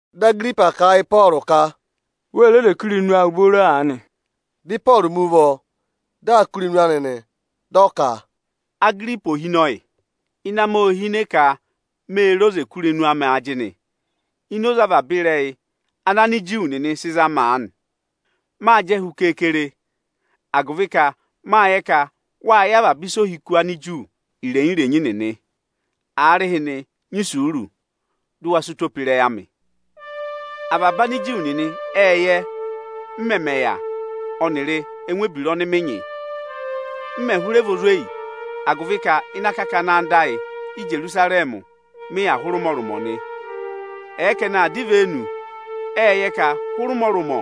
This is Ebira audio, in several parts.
Dị Agiripa kà a yị Ịpọọrụ ka, “Wê re oze kụ́ irenu awụ booro aanị.” Dị Ịpọọrụ mi ụvọ, dị aa kụ́ irenu anị nị. Dị ọ ka: “Agiripa ohinọyị, ịnẹ amị ô hine ka mê re oze kà irenu amị ajịnị ini oze avaba ịrẹyị ana Aniju nịnị sị za mị aanị. Mâ jẹ hu keekere, agụvị ka mâ yẹ ka wâ yẹ avaba ịsa ohiku Aniju irenyi-irenyi nịnị. Aarịhịnị, nyị isuuru, dụ wa sị ụtọ pe ịrẹyị amị! “Avaba Aniju nịnị ệ yẹ, m mẹmẹ yà ọnịrị ẹngụ ebira ọnị mị nyị, m mẹ̀ hụrẹ vị ozweyi, agụvị ka ịnị akakana anda ayị Íjerusarẹmị mị yà hụrẹ ụmọrụmọ nị. Ẹ̀ẹ ka ẹnị aa dọ ivenu, ệ yẹ ka hụrẹ ụmọrụmọ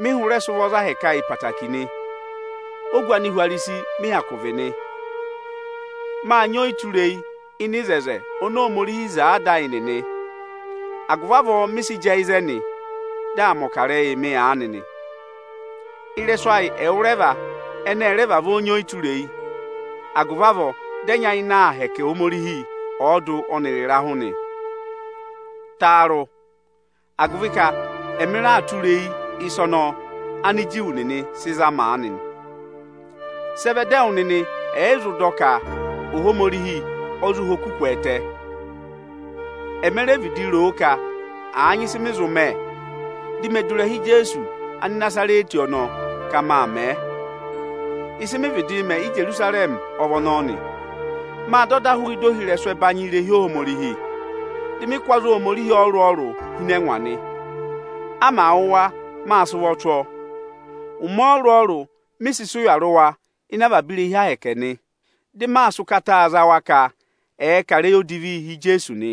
mị hụrẹ sị ụvọ za ahẹkẹ ayị ẹtẹẹtẹrẹ nị. Ogu Anihwarisi mị hyakụ vị nị. Mâ nyị ọyịtureyi ịnị oto oni Ohomorihi wo yị ada ayị nịnị, agụvị avọọ mị sị jẹẹ ịzẹnị dị aa mẹ̀ ọkarẹyị mị aanị nị. Ịrẹsụ ayị ẹwụrẹva ẹnị ẹ rẹ vavọọ nyị ọyịtureyi, agụvị avọọ dị ẹ nyayịnẹ aa hẹkẹ Ohomorihi ọọdụ ọnịrị ịrahụ nị. Taarụ, agụvị ka ẹmị raa tụra eyi ịsa ọnọọ Ániju nịnị sị za mị aanị nị. Sị ẹ vẹ dị ẹwụ nịnị ẹ̀ yị zụ dọ ka Ohomorihi ọ zụ ha oku kwẹẹtẹ? Eme re vịdị roo ka àa nyị ịsị mị zụ mẹ, di me du ịrẹha Ijeesu Anịnazarẹtị ọnọọ ka maa mẹẹ. Ịsị mị vịdị mẹ Íjerusarẹmị ọ vị ọnọọ nị. Mâ dọ ọda hụụ ịda ohirẹsụ ẹbanyị irehi Ohomorihi, dị mị kụ́ aza Ohomorihi ọrụrụ-ọrụrụ hi ịnị ẹngwa nị. A màa wụ̀ wa, mâ sị ụvọ tụ́ ọọ. Ụmẹ ọrụrụ-ọrụrụ mị sị sị ụya rị wa ịnị avaba irehi Ohomorihi nị, dị maa sị ụkata za wa ka ẹ̀ẹ kà ịrẹyị odivii hi Ijeesu nị.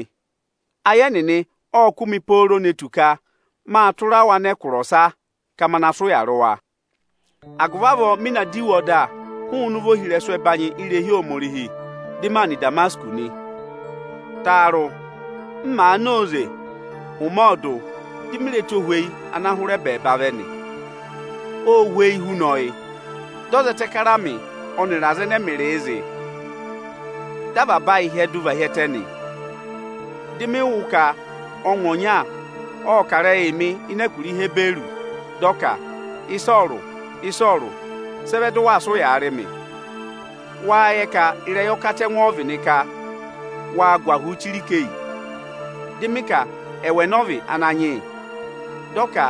Ayị ẹnịnị ộ kụ́ mị pooro ne tù ka mâ tụra wa nọ ẹkụra ọsa ka ma na sị ụya rị wa.” “Agụvị avọọ mị na dọ iwe ọda hụụnị ụvọ ohirẹsụ ẹbanyị irehi Ohomorihi, dị maa nọ Ịdamasịkọsị nị. Taarụ, m màa na óze ụmẹ ọọdụ, di mi re ẹtohweyi ana hụrẹ ẹbẹẹba vẹ nị. Ô hweyi huna ọyị. Dị ọ zẹtẹ kara mị ọnịrị aza ẹnẹ ẹmịrịị zị. Dị avaba ayị hyẹdụ và hi ẹtẹ nị.” Dị mị wụ́ ka ọngwẹ ọnya ộ kà ịrẹyịị mị ịnị ẹkụra Ihiburu, dị ọ ka: “Ịsọọrụ, Ịsọọrụ, sị ẹ vẹ dị waa sị ụyaa rị mị? Wáá yẹ ka ịrẹyị ọkatẹngụ ọ vị nị ka waa gụ ahụụ chire ikeyi?” Dị mị ka, “Ẹwụ ẹnị ọ vị, Ananyị yị?” Dị ọ ka,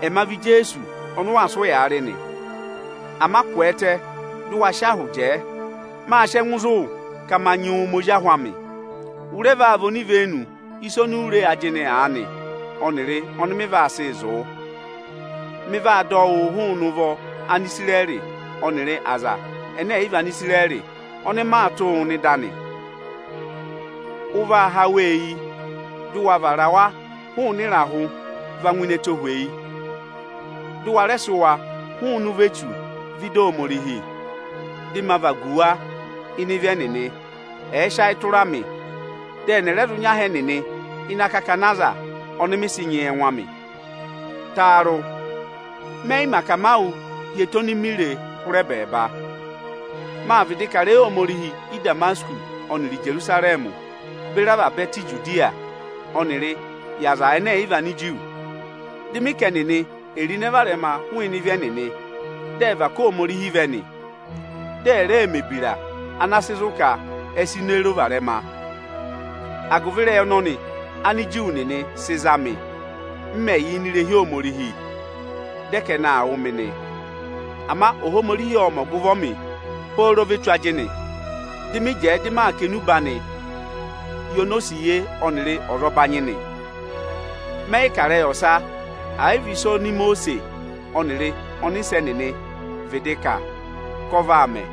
“Ẹma vị Ijeesu ọnị ụ waa sị ụyaa rị nị. Ama kwẹẹtẹ jẹẹ! Mâ sị ẹngụ zụ̀ wụ ka ma nyị wụ mẹ ozi ahụ amị. Ụ rẹ vaa vị onivenu ịsa oni u re ajịnị aanị ọnịrị ọnị mị vaa sịị zụ̀ wụ. Mị vaa dọ wụụ tụ́ hụụnị ụvọ Anisirẹrị ọnịrị aza ẹnẹ ẹ̀ yị vị Anisirẹrị ọnị maa tụ́ wụụ nọ ịda anị. Ụ vaa há wa eyi, dụ wa vara wa hụụnị ịrahụ va ngụ ini ẹtohweyi. Dị ụ wa rẹ sị wa hụụnị ụvọ Echu vẹ ịda Ohomorihi, dị ma vagu wa ịnị ịvị ẹnịnị, ẹ̀ẹ sị ayị tụra mị. Dị ẹnị ẹ̀ rẹ zụ nyị aha ẹnịnị ịnị akakana aza ọnị mị sị nyị yị ẹngụ amị.” “Taarụ, mẹ yị mẹ akamawụ hi ẹtẹ oni mi re hụrẹ ẹbẹẹba. Mâ vịdị kà ịrẹyị Ohomorihi Ị́damasịkọsị ọnịrị Íjerusarẹmị beri avaba ẹtẹ Ijudiya ọnịrị yị Anigiriki. Dị mị ka ẹnịnị è ro ịnẹ varẹma hụụnị ịvị ẹnịnị, dị ẹ̀ va ká Ohomorihi vẹ nị. Dị ẹ̀ rẹ mẹ̀ ebira ana sị zụ̀ ka ẹ sị ịnẹ ro varẹma. Agụvị ịrẹyị ọnọnị Ániju nịnị sị za mị, m mẹ̀ yà ini irehi Ohomorihi, dị ẹ ka ẹnị aa wụ̀ mị nị. Ama Ohomorihi ộ mẹ̀ ọgụvọ mị pooro ve tù ajịnị, dị mị jẹẹ dị maa kà enube anịị yị onosiye ọnịrị azọbanyị nị. Mẹ yị kà ịrẹyị ọsa, ẹ̀ yị vị ịsị Imosiisi ọnịrị ọnịsẹ nịnị vịdị kà a ka ọ vaa mẹ.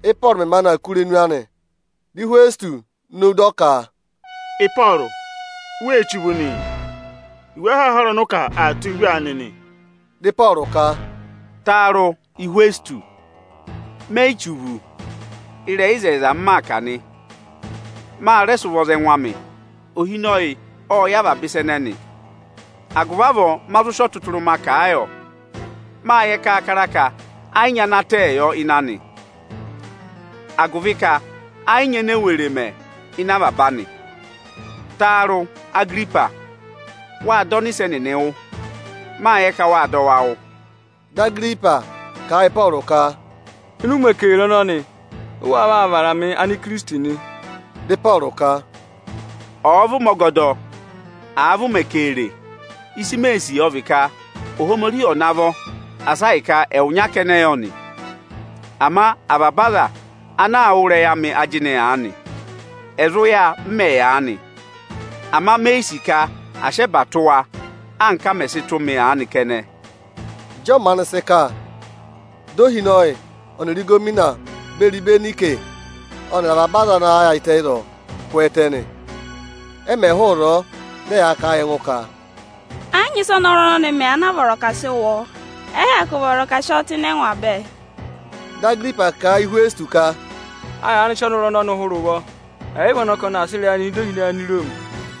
Ị́pọọrụ mẹ̀ maanị aa kụ́ irenu anị, dị Ịhwẹsịtọsị nowu dị ọ ka, “Ịpọọrụ, u wee che uvu nị! Iwe ahaahara ọnị ụ kà, aa tụ́ wụ uvu aanị!” Dị Ịpọọrụ ka, “Taarụ! Ịhwẹsịtọsị, me yi che uvu. Ịrẹyị ịzẹyịza m maa kà nị. Ma rẹ sị ụvọ za ẹngụ amị. Ohinọyị ộ yẹ avaba ịsa ẹnẹnị, agụvị avọọ ma zụ sị ọtụtụrụma kà a yọ. Mâ yẹ kaakara ka ẹ yị nyị ana tẹẹ yọ ịnị anị; agụvị ka ẹ yị nyị enee were mẹ ịnị avaba anị. Taarụ, Agiripa, wáá dọ ọnịsẹ nịnị wụ́? Mâ yẹ ka wâ dọ wa wụ́.” Dị Agiripa kà a yị Ịpọọrụ ka, “Ịnị ụmẹ keere ọnọnị, ụ waa vaa vara mị Anikirisiti nị?” Dị Ịpọọrụ ka, “Ọ̀ọ vị ụmẹ ọgọdọ, àa vị ụmẹ keere, ịsị mee sì, ọ vị ka Ohomorihi ọ̀ navọ asị ahịka ẹwụnya kẹnẹ yọ nị, ama avaba aza ana aa wụ́ ịrẹyị amị ajịnị aanị, ẹ̀ zụ yà, m mẹ̀ yà aanị. Ama me yi sì ka à sị ẹba tụ́ wa, anka a mẹ̀ sị tụ́ mị aanị kẹnẹ.” Ịjị ọ maanị sị kà, di ohinọyị ọnịrị ịgọvọnọ beri Ịbẹnayịsị ọnịrị avaba aza ana yaayịtẹ ịzọọ kwẹẹtẹ nị. Ẹ mẹ̀ hụụ ịzọọ, dị ẹyaa kà a yị ẹngụ ka, “Ẹ yị nyị ịsị ọnọrụ ọnọnị mẹ anaa vọrọ ka à sị wụ ọọ. Ẹ yị hyakụ vọrọ ka à sị ọọ tụ́ ịnị ẹngwa bẹẹ.” Dị Agiripa kà a yị Ịhwẹsịtọsị ka, “A yaanị sị ọnọrụ ọnọnị hụrẹ ụvọ, ẹ̀ ị vị ọnị ọ ka ọnị aa sị ịrẹyị anịị nọ ịda ohinọyị Aniroomi.”